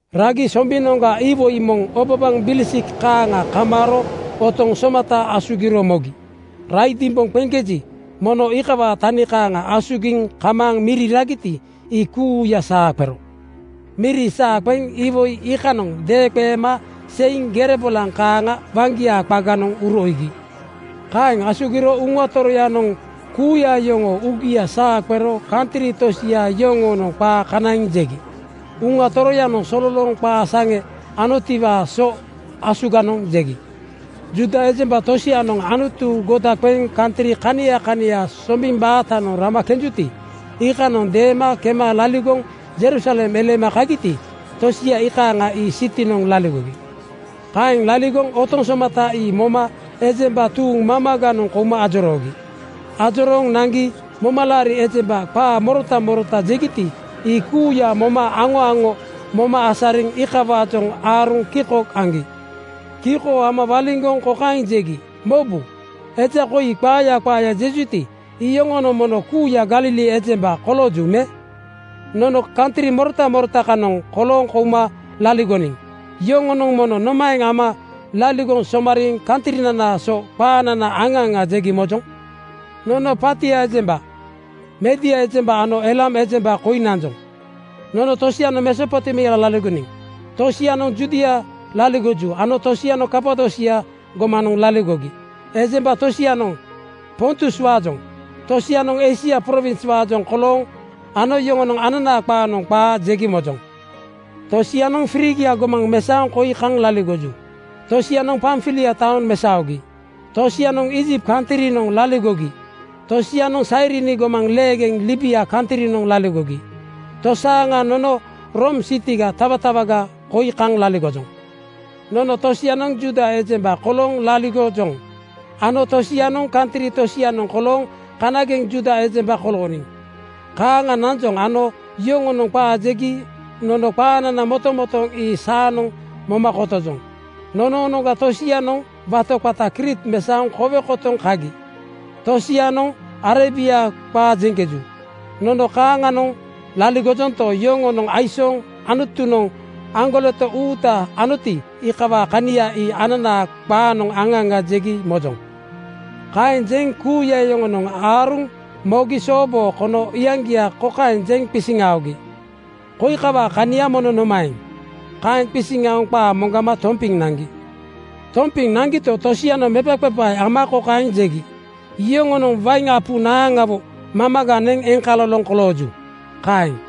Ragi Sombinoŋga iwoi moŋ obabaŋ bilisik kaaŋa kamaaro otoŋ somata asugiro mogi. Raidimbonoŋ qeŋkeji, mono iikawaa tani kaaŋa asugiŋ kamaaŋ miri ragiti, ii kuuya saa qero. Miri saa qeŋ iwoi iikanoŋ deeŋqeema seiŋ gere bolaŋ kaaŋa waŋgia qaganoŋ uro iigi. Kaeŋ asugiro Uŋa Toroyanoŋ kuuya yoŋoo uugia saa qero kantri tosia yoŋoonoŋ qaa kanaiŋ jegi. Uŋa Toroyanoŋ sololooŋ qaa saŋe anotiwaa so asuganoŋ jegi. Juuda ejemba tosianoŋ Anutu goda qeŋ kantri kania kania sombiŋ baatanoŋ rama kenjuti, iikanoŋ deema kema laligoŋ Jerusalem eleema kagiti, tosia iikaaŋa ii sitinoŋ laligogi. Kaeŋ laligoŋ otoŋ somata ii moma ejemba tuuŋ mamaganoŋ kouma ajoroogi. Ajorooŋ naŋgi momalaari ejembanoŋ qaa morota morota jegiti, ii kuuya moma aŋo aŋo moma asariŋ iikawaajoŋ aaruŋ kiko aŋgi. Kiko ama waliŋgoŋ kokaeŋ jegi, “Mobu! Eja koi qaaya qaaya jejuti, iyoŋonoŋ mono kuuya Galili ejembaga kolooju me? Nono kantri morota morota kanoŋ kolooŋ kouma laligoniŋ yoŋonoŋ mono nomaeŋ ama laligoŋ somariiŋ kantrinanaa so qaanana aŋa aŋa jegi mojoŋ? Nono Partia ejemba, Midia ejemba ano Eelam ejemba koi nanjoŋ. Nono tosianoŋ Mesopotemia laligoniŋ. Tosianoŋ Judia laligoju ano tosianoŋ Kapadosia gomanoŋ laligogi. Ejemba tosianoŋ Pontuswaajoŋ, tosianoŋ Eisia prowinswaajoŋ koloojoŋ ano yoŋonoŋ ananaa qaanoŋ qaa jegi mojoŋ. “Tosianoŋ Frigia gomaŋ mesaoŋ koi kaŋ laligoju. Tosianoŋ Pamfilia taoŋ mesaogi. Tosianoŋ Iijipt kantrinoŋ laligogi. Tosianoŋ Sairini gomaŋ leegeŋ Libia kantrinoŋ laligogi. Tosaaŋa nono Room sitiga tawatawaga koi kaŋ laligojoŋ. Nono tosianoŋ Juuda ejemba kolooŋ laligojoŋ ano tosianoŋ kantri tosianoŋ kolooŋ kanageŋ Juuda ejemba kolooniŋ. Kaaŋa nanjoŋ ano yoŋonoŋ qaa jegi nono qaanana motomotooŋ ii saanoŋ moma kotojoŋ. Nonoonoŋga tosianoŋ wato qata Kriit mesaoŋ kowe kotoŋ kagi. Tosianoŋ Arebia qaa jeŋkeju. Nono kaaŋanoŋ laligojonto, yoŋonoŋ aisooŋ Anutunoŋ aŋgoleto uuta anoti, iikawaa kania ii ananaa qaanoŋ aŋa aŋa jegi mojoŋ.” Kaeŋ jeŋ kuuya yoŋonoŋ aaruŋ mogi sooboo kono iyaŋgia kokaeŋ jeŋ qisiŋ aogi, “Koi kawaa kania mono nomaeŋ?” Kaeŋ qisiŋ aoŋ qaa moŋgama tompiŋ naŋgi. Tompiŋ naŋgito, tosianoŋ mepaqepae ama kokaeŋ jegi, “Yoŋonoŋ wain apu naaŋawo mamaga neŋ eŋkaloloŋ kolooju.” Kaeŋ.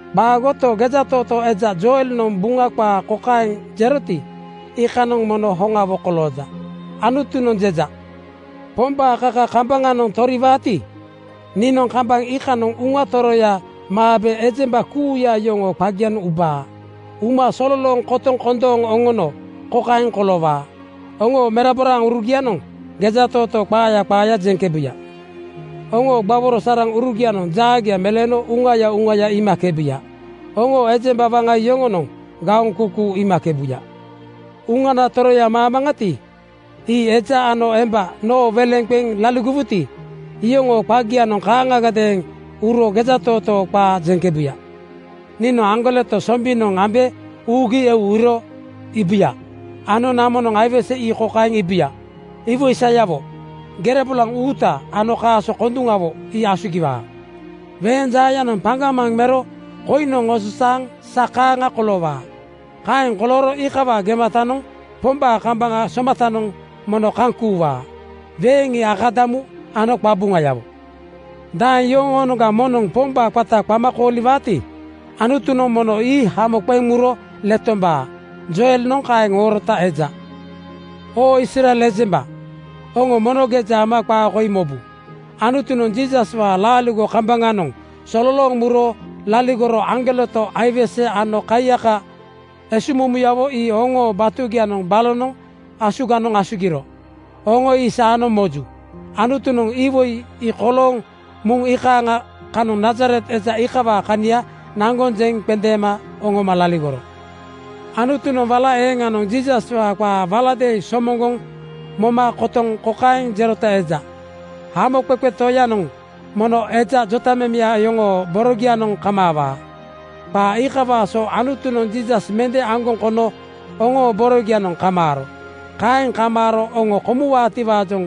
Qaagoto, gejatootoo eja Joelnoŋ Buŋa qaa kokaeŋ jeroti, iikanoŋ mono hoŋawo kolooja, ‘Anutunoŋ jeja: Pombaa kaka kambaŋanoŋ toriwaati, niinoŋ kambaŋ iikanoŋ Uŋana Toroya maabe ejemba kuuya yoŋoo qagianoŋ ubaa. Uma sololooŋ kotoŋ kondooŋ oŋono kokaeŋ koloowaa: Oŋoo meraboraurugianoŋ gejatootoo qaaya qaaya jeŋkebuya. Oŋoo gbaworo saraŋurugianoŋ jaagia meleeno uŋaya uŋaya iimakebuya. Oŋoo ejemba waŋa yoŋonoŋ gaoŋ kuukuu iimakebuya. Uŋana Toroya maamaŋati, ii eja ano emba noo weleŋ qeŋ laligowuti, iyoŋoo qagianoŋ kaaŋagadeeŋ uro gejatootoo qaa jeŋkebuya. Niinoŋ aŋgoleto sombinoŋ ambe uugi eu uro iibuya ano namonoŋ aiwese ii kokaeŋ iibuya: Iwoi sayawo, gere bolaŋ uuta ano kaaso konduŋawo ii asugiwuya. Weeŋ jaayanoŋ paŋgamaŋ mero koiŋnoŋ ososaaŋ sa kaaŋa koloowaa. Kaeŋ kolooro iikawaa gematanoŋ Pombaa kambaŋ somatanoŋ mono kaŋ kuuwaa. Weeŋ ii akadamu ano qabuŋayawo. Daeŋ yoŋoonoŋga moŋnoŋ Pombaa qata qama kooliwaati, Anutunoŋ mono ii hamo qeŋ muro letombaa.’ Joelnoŋ kaeŋ oorota eja. “Oo Israel ejemba, oŋo mono geja ama qaa koi mobu: Anutunoŋ Jiisaswaa laaligo kambaŋanoŋ sololooŋ muro laligoro aŋgoleto, aiwese ano kaiyaka esuŋmumuyawo ii oŋoo batugianoŋ balonoŋ asuganoŋ asugiro. Oŋo ii saanoŋ moju. Anutunoŋ iwoi ii kolooŋ muŋ iikaaŋa kanoŋ Nazaret eja iikawaa kania naŋgoŋ jeŋ qendeema oŋoma laligoro. “Anutunoŋ wala eeŋanoŋ Jiisaswaa qaa waladeeŋ somoŋgoŋ moma kotoŋ kokaeŋ jerota eja, ‘Hamoqeqe Toyanoŋ mono eja jotamemeya oŋoo borogianoŋ kamaawaa.’ Qaa iikawaa so Anutunoŋ Jiisas mende aŋgoŋ kono oŋoo borogianoŋ kamaaro. Kaeŋ kamaaro oŋo komuwaatiwaajoŋ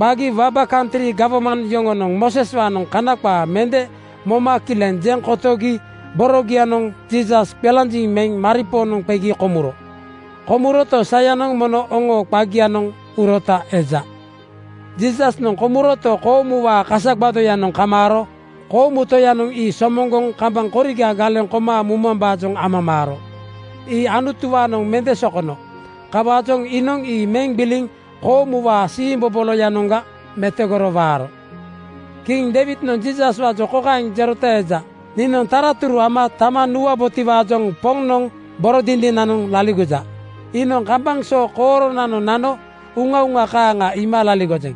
qagi waba kantri gawman yoŋonoŋ Mooseswaanoŋ Kana qaa mende moma kileŋ jeŋ kotogi borogianoŋ Jiisas qelanjiŋ meŋ maripoonoŋ qegi komuro. Komuroto, sayanoŋ mono oŋoo qagianoŋ urota eja. Jiisasnoŋ komuroto, koomuwaa kasa gbadoyanoŋ kamaaro koomu Toyanoŋ ii somoŋgoŋ kambaŋ koriga galeŋ koma mumambaajoŋ amamaaro. Ii Anutuwaanoŋ mende sokono. Kawaajoŋ iinoŋ ii meŋ gbiliŋ koomuwaa siimboboloyanoŋga metogoro waaro. Kiŋ Deiwidnoŋ Jiisaswaajoŋ kokaeŋ jerota eja, ‘Niinoŋ taraturu ama tama nuwabotiwaajoŋ Poŋnoŋ boro dindinanoŋ laligoja. Iinoŋ kambaŋ so kooronanoŋ nano uŋauŋa kaaŋa iima laligojeŋ.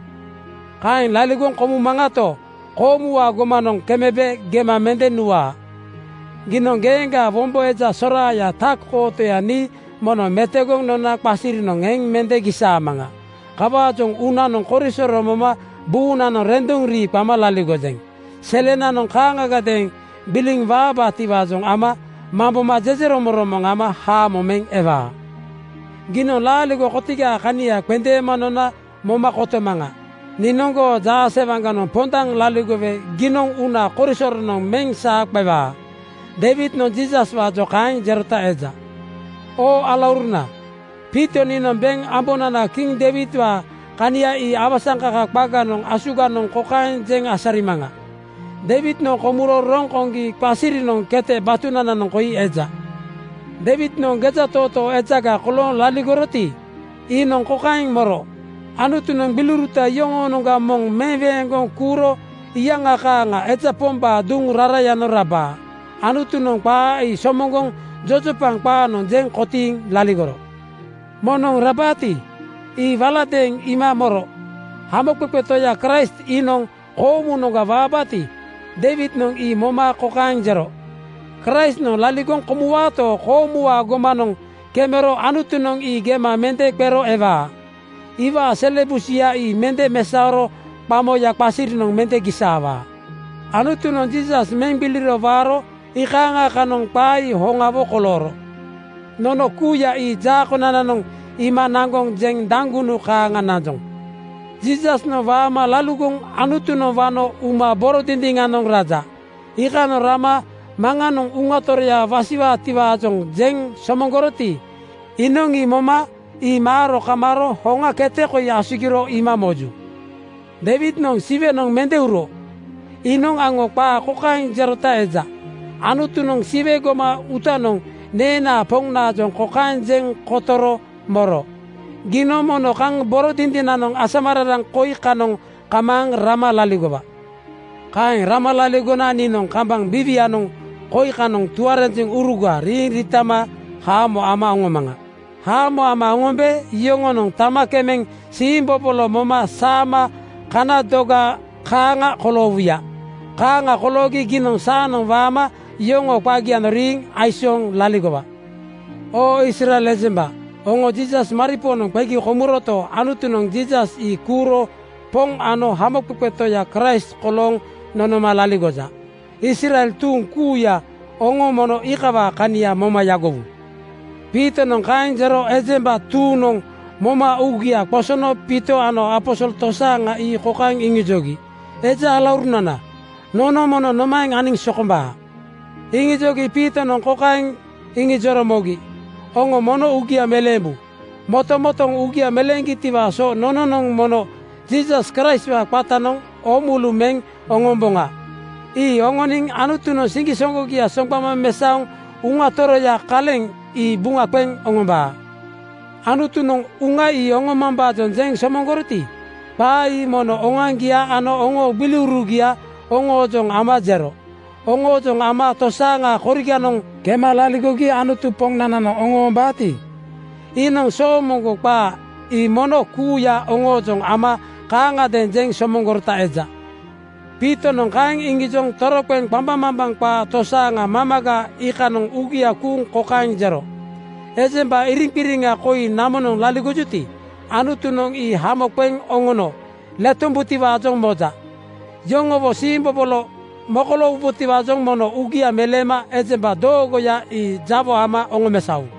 Kaeŋ laligoŋ komumaŋato, koomuwaa gomanoŋ kemebe gema mende nuwaa. Giinoŋ geeŋgaa wombo eja soraaya tak-kootoya nii mono metogoŋ nona qasirinoŋ eŋ mende gisaamaŋa. Kawaajoŋ uunanoŋ korisoro moma buunanoŋ renduŋ rii qama laligojeŋ. Selenanoŋ kaaŋagadeeŋ gbiliŋ waabaatiwaajoŋ ama mamboma jejeromoŋromoŋ ama haamo meŋ ewaa. Giinoŋ laaligo kotigaa kania qendeema nona moma kotomaŋa. Niinoŋ goo jaasewaŋganoŋ pondaŋ laligowe giinoŋ uuna korisoronoŋ meŋ saa qewaa.’ Deiwidnoŋ Jiisaswaajoŋ kaeŋ jerota eja. “Oo alauruna, Piito niinoŋ beŋ ambonana kiŋ Deiwidwaa kania ii awasaŋkaka qaganoŋ asuganoŋ kokaeŋ jeŋ asarimaŋa: Deiwidnoŋ komuro roŋ koŋgi qasirianoŋ kete batunananoŋ koi eja. Deiwidnoŋ gejatootoo ejaga kolooŋ laligoroti, iinoŋ kokaeŋ moro: Anutunoŋ gbiliuruta yoŋoonoŋga moŋ meweeŋgoŋ kuuro iyaŋa kaaŋa eja pombaa duŋ rarayanoŋ rabaa. Anutunoŋ qaa ii somoŋgoŋ jojopaŋ qaanoŋ jeŋ kotiiŋ laligoro. Moŋnoŋ rabaati, ii waladeeŋ iima moro. Hamoqeqe Toya Kraist iinoŋ koomunoŋga waabaati, Deiwidnoŋ ii moma kokaeŋ jero, ‘Kraistnoŋ laligoŋ komuwaato, koomuwaa gomanoŋ kemero Anutunoŋ ii gema mende qero ewaa. Iwaa sele busuya ii mende mesaoro qamoyanoŋ qasirinoŋ mende gisaawaa.’ Anutunoŋ Jiisas meŋ gbiliro waaro iikaaŋa kanoŋ qaa ii hoŋawo kolooro. Nono kuuya ii jaa konananoŋ iima naŋgoŋ jeŋ daŋgunu kaaŋa nanjoŋ. Jiisasnoŋ waama laligoŋ Anutunoŋ wano uma boro dindiŋanoŋ raja. Iikanoŋ rama Maŋanoŋ Uŋa Toroya wasiwaatiwaajoŋ jeŋ somoŋgoroti, iinoŋ (promis) ii moma ii maaro kamaaro hoŋa kete koi asugiro iima moju. Deiwidnoŋ Siwenoŋ mende uro. Iinoŋ aŋo qaa kokaeŋ jerota eja, ‘Anutunoŋ Siwe gomaŋ uutanoŋ neenaa Poŋnaajoŋ kokaeŋ jeŋ kotoro moro: Giinoŋ mono kaŋ boro dindinanoŋ asamararaŋ koi kanoŋ kamaaŋ rama laligowa. Kaeŋ rama laligona niinoŋ kambaŋ biiwianoŋ koi kanoŋ tuarenjeŋuruga riiŋ riitama haamo ama oŋomaŋa. Haamo ama oŋombe yoŋonoŋ tama kemeŋ siimbobolo moma saama kana doga kaaŋa koloowuya. Kaaŋa koloogi giinoŋ saanoŋ waama yoŋoo qagianoŋ riiŋ aisooŋ laligowa.’ “Oo Israel ejemba, oŋo Jiisas maripoonoŋ qegi komuroto, Anutunoŋ Jiisas ii kuuro Poŋ ano Hamoqeqe Toya Kraist kolooŋ nonoma laligoja. Israel tuuŋ kuuya oŋo mono iikawaa kania moma yagowu.” Piitonoŋ kaeŋ jero ejemba tuuŋnoŋ moma uugia qosono Piito ano aposol tosaaŋa ii kokaeŋ iŋijogi, “Eja alaurunana, nono mono nomanomaeŋ aniŋ sokombaa?” Iŋijogi Piitonoŋ kokaeŋ iŋijoro mogi, “Oŋo mono uugia meleembu. Motomotooŋ uugia meleeŋgitiwaa so nononoŋ mono Jiisas Kraistwaa qatanoŋ oo mulu meŋ oŋomboŋa. Ii oŋoniŋ Anutunoŋ siŋgisoŋgogia soŋgbama mesaoŋ Uŋa Toroyaa kaleŋa ii buŋa qeŋ oŋombaa. Anutunoŋ Uŋa ii oŋomambaajoŋ jeŋ somoŋgoroti, qaa ii mono oŋoaŋgia ano oŋoo gbiliurugia oŋoojoŋ ama jero. Oŋoojoŋ ama tosaaŋa koriganoŋ kema laligogi Anutu Poŋnananoŋ oŋoombaati, iinoŋ soomoŋgo qaa (promis) ii mono kuuya oŋoojoŋ ama kaaŋagadeeŋ jeŋ somoŋgorota eja.” Piitonoŋ kaeŋ iŋijoŋ toroqeŋ qambaŋmambaŋ qaa tosaaŋa mamaga iikanoŋ uugia kuuŋ kokaeŋ jero, “Ejemba iriŋqiriŋa koi namonoŋ laligojuti, Anutunoŋ ii hamo qeŋ oŋono letombutiwaajoŋ moja. Yoŋowo siimbobolo mokoloowubotiwaajoŋ mono uugia meleema ejemba doogoya ii jawo ama oŋomesaowu.”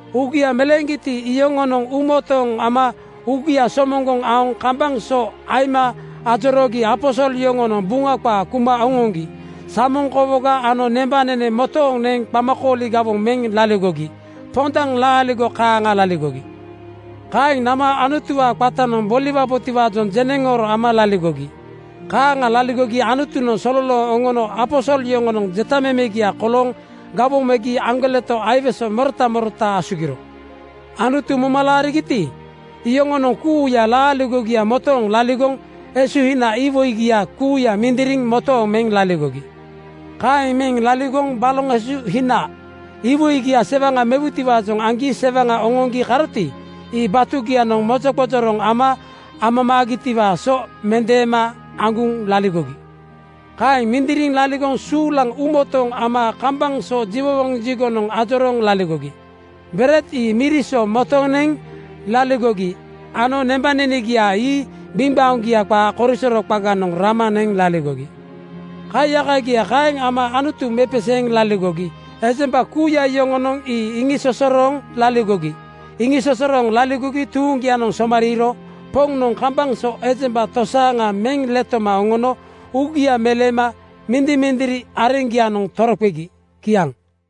Uugia meleeŋgiti, iyoŋonoŋ uumotooŋ ama uugia somoŋgoŋ aoŋ kambaŋ so aima ajoroogi aposol yoŋonoŋ Buŋa qaa kuma oŋoŋgi samoŋ kowoga ano nembanene motoŋ neŋ qamakooli gawoŋ meŋ laligogi. Pondaŋ laaligo kaaŋa laligogi. Kaeŋ nama Anutuwaa qatanoŋ boliwabotiwaajoŋ jeneŋooro ama laligogi. Kaaŋa laligogi Anutunoŋ sololooŋ oŋono aposol yoŋonoŋ jetamemegia kolooŋ gawoŋ megi aŋgoleto aiwese morota morota asugiro. Anutu moma laarigiti, iyoŋonoŋ kuuya laaligogia motooŋ laligoŋ esuhina (tiwomaleku) iwoigia kuuya mindiriŋ motooŋ meŋ laligogi. Kaeŋ meŋ laligoŋ baloŋ esuhina iwoigia sewaŋa mewutiwaajoŋ aŋgi sewaŋa oŋoŋgi karoti, ii batugianoŋ mojoqojoroŋ ama amamaagitiwaa so mendeema aŋguŋ laligogi. Kaeŋ mindiriŋ laligoŋ suulaŋ uumotooŋ ama kambaŋ so jiwowoŋ jigonoŋ ajorooŋ laligogi. Bered ii miri so motoŋ neŋ laligogi ano nembanenegia ii gbiŋgbaoŋgia qaa korisoro qaganoŋ rama neŋ laligogi. Kaiyakagia kaeŋ ama Anutu mepeseeŋ laligogi ejemba kuuya yoŋonoŋ ii iŋisosorooŋ laligogi. Iŋisosorooŋ laligogi tuuŋgianoŋ somariiro Poŋnoŋ kambaŋ so ejemba tosaaŋa meŋ letoma oŋono uugia meleema mindimindiri areŋgianoŋ toroqegi. Kiaŋ.